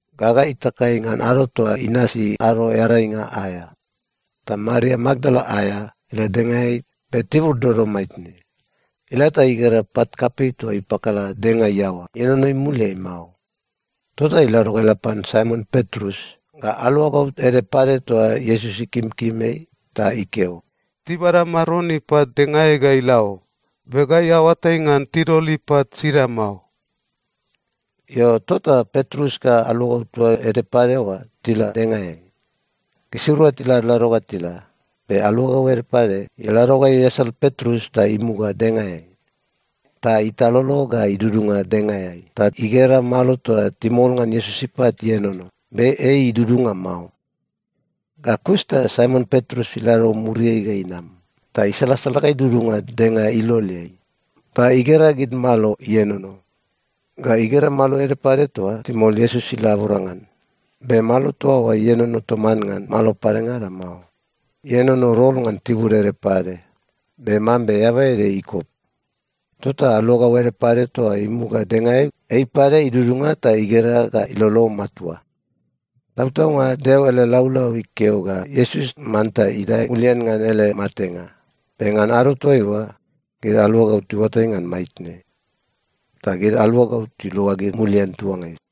Gaga itakai ngan ado toa inasi Ado Earainga aea, ta Maria Makdala aea ila dengaeai be tibur dodom maitne. Ila ta igera pat kapei toa ipakala denga iaoa ienono imuliai mao. Tota ilado ga ila pan Saimon Petrus ga aluagau ede pade toa Iesus ikimkim ei, ta ikeo, “Tibada Maron ipat dengaeai ga ila o. Be gai aoatai ngan tidol ipat sida mao!” Io, tota Petrus ga aluagau toa ede pade oa tila dengaeai. Gisirua tiladlado ga tila, be aluagau ede pade ilado ga iasal Petrus ta imuga dengaeai. Ta italolo ga idudunga dengaeai ta igera malo toa timol ngan Iesus ipat ienono, be ei idudunga mao. Ga kus ta Saimon Petrus ilado muriai ga inam ta isalasala ga idudunga denga iloleai. Ta igera gid malo ienono. Ga igera malo ede pade toa timol Iesus ilabora ngan. Be malo toa oa ienono toman ngan malo padengada mao. Ienono rol ngan tibur ede pade, be mambe eaba ede ikop. Tota aluagau ede pade toa imuga dengaeai, ei pade idudunga ta igera ga ilolo matua. Tautaunga Deo ele laulau ikeo ga Iesus manta idae mulian ngan ele matenga, be ngan ado toaiua, gid aluagau tiuatai ngan maitne. Ta gid aluagau tiluagid mulian tuangai.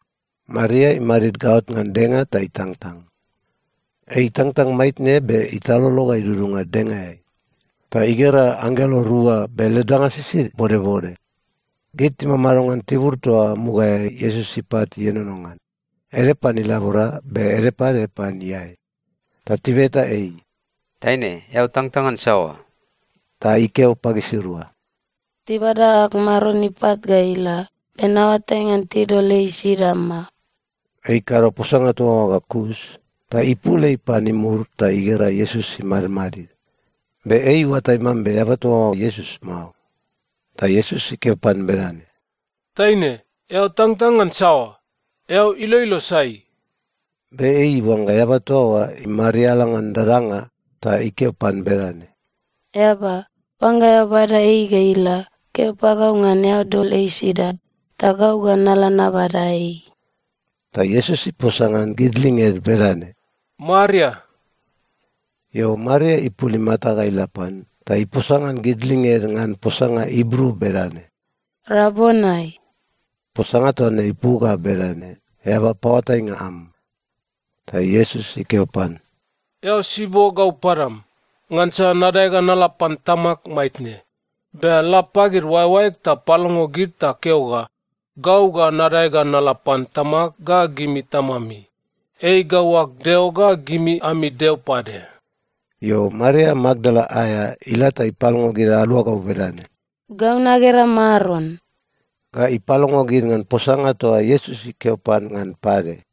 Maria imadid gaot ngan denga ta itangtang. Ei itangtang maitne be italolo ga idudunga dengaeai. Ta igera anggelo rua be led danga sisid bodbode. Gid timamado ngan tibur toa mugaeai Iesus ipat ienono ngan, ede pan ilabora be ede pade pan iae. Ta tibeta ei, “Taine, eao tangtang ngan saoa?” Ta ikeo pagisirua, “Tibada ag Maron ipat ga ila, be naoatai ngan tidol ei sida mao.” Ei ikado posanga toa oa ga kus ta ipul ei pan imur ta igera Iesus imadmadid. Be ei iuatai mambe eaba toa oa Iesus mao. Ta Iesus ikeo pan bedane, “Taine, eao tangtang ngan saoa? Eao iloilo sai?” Be ei iuangga eaba toa oa imariala ngan dadanga ta ikeo pan bedane, “Eaba, oangga eao bada ei ga ila, keo pagau ngan eao dol ei sida, ta gau ga nala nabada ei.” Ta Iesus iposa ngan gid linged bedane, “Maria.” Io, Maria ipul imata ga ila pan ta iposa ngan gid linged ngan posanga Ibru bedane, “Rabonai!” (Posanga toa ne ipu ga bedane, “Eaba paoatainga am.”) Ta Iesus ikeo pan, “Eao sibo gau padam, ngansa nadae ga nala pan Tamag maitne. Be la pagid oaeoaeg ta palongo gid ta keo ga gau ga nadae ga nala pan Tamag ga gimi Tamami. Ei gau ag Deo ga gimi ami Deo pade.” Io, Maria Makdala aea ila ta ipalongo gid aluagau bedane, “Gau nagera Maron!” Ga ipalongo gid ngan posanga toa Iesus ikeo pan ngan pade.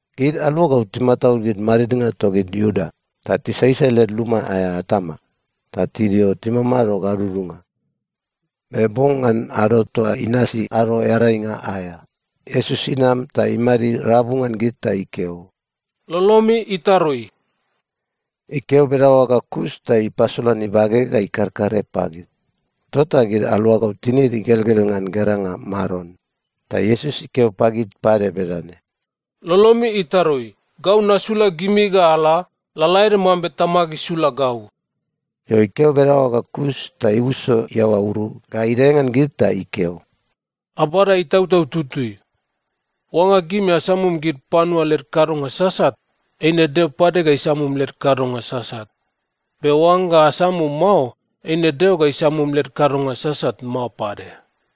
Gid aluagau timataud gid madidnga togid Iuda ta tisaisai led luma aea atama ta tidio timamado gadudunga. Be bong ngan ado toa inasi Ado Earainga aea, Iesus inam ta imadid rabu ngan gid ta ikeo, “Lolomi itarui!” Ikeo bedaoa ga kus ta ipasolan ibage ga ikarkare pagid. Tota gid aluagau tinid igelgel ngan geranga Maron. Ta Iesus ikeo pagid pade bedane, “Lolomi itarui. Gau nasula gimi ga ala, lalaede mambe Tamag isula gau.” Io, ikeo bedaoa ga kus ta iuso iaoa uru ga idae ngan gid ta ikeo, “Abada Itautau Tutui! Oangga gimi asamum gid panua led kadonga sasat, eine Deo pade ga isamum led kadonga sasat. Be oangga asamum mao, eine Deo ga isamum led kadonga sasat mao pade.”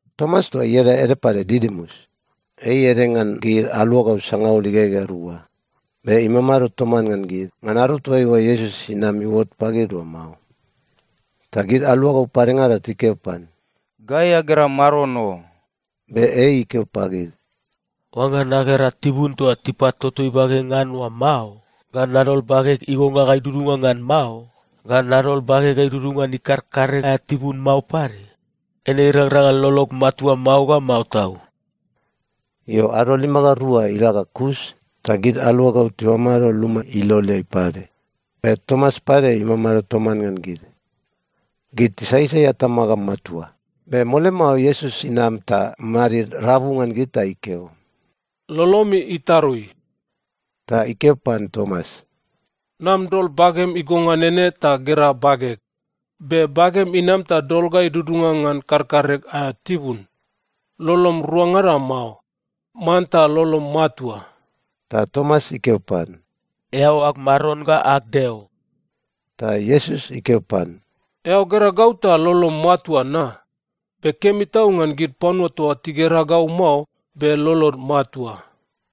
Tomas toa ieda ede pade Didimus, ei ede ngan gid aluagau sangaul igegea rua, be imamado toman ngan gid ngan ado toaiua Iesus inam iuot pagid oa mao. Ta gid aluagau padengada tikeo pan, “Gai agera Maron o!” Be ei ikeo pagid, “Oangga nagera tibun toa tipatoto ibage ngan oa mao, ga nadol bageg igonga ga idudunga ngan mao, ga nadol bageg ga idudunga ngan ikarkare aea tibun mao pade, eine irangrang ngan lolog matua mao ga mao tau.” Io, ado lima ga rua ila ga kus, ta gid aluagau timamado luma iloleai pade, be Tomas pade imamado toman ngan gid. Gid tisaisai atama ga matua, be mole mao Iesus inam ta imadid rabu ngan gid ta ikeo, “Lolomi itarui!” Ta ikeo pan Tomas, “Nam dol bagem igonga nene ta gera bageg. Be bagem inam ta dol ga idudunga ngan karkareg aea tibun. Lolom ruangada mao. Manta lolom matua.” Ta Tomas ikeo pan, “Eao ag Maron ga ag Deo!” Ta Iesus ikeo pan, “Eao gera gau ta lolom matua na? Be kemi tau ngan gid panua toa tigera gau mao be lolod matua.”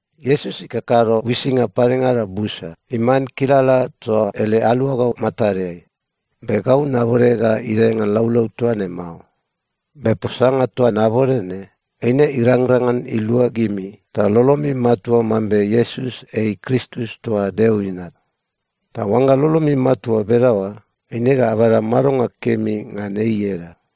Iesus ikakado uisinga padengada busa iman kilala toa ele aluagau matadeai. Be gau nabode ga idae ngan laulau toa ne mao. Be posanga toa nabode ne, eine irangrang ngan ilua gimi ta lolomi matua mambe Iesus ei Kristus toa Deo Inat. Ta oangga lolomi matua bedaoa, eine ga abada madonga kemi ngan ei ieda.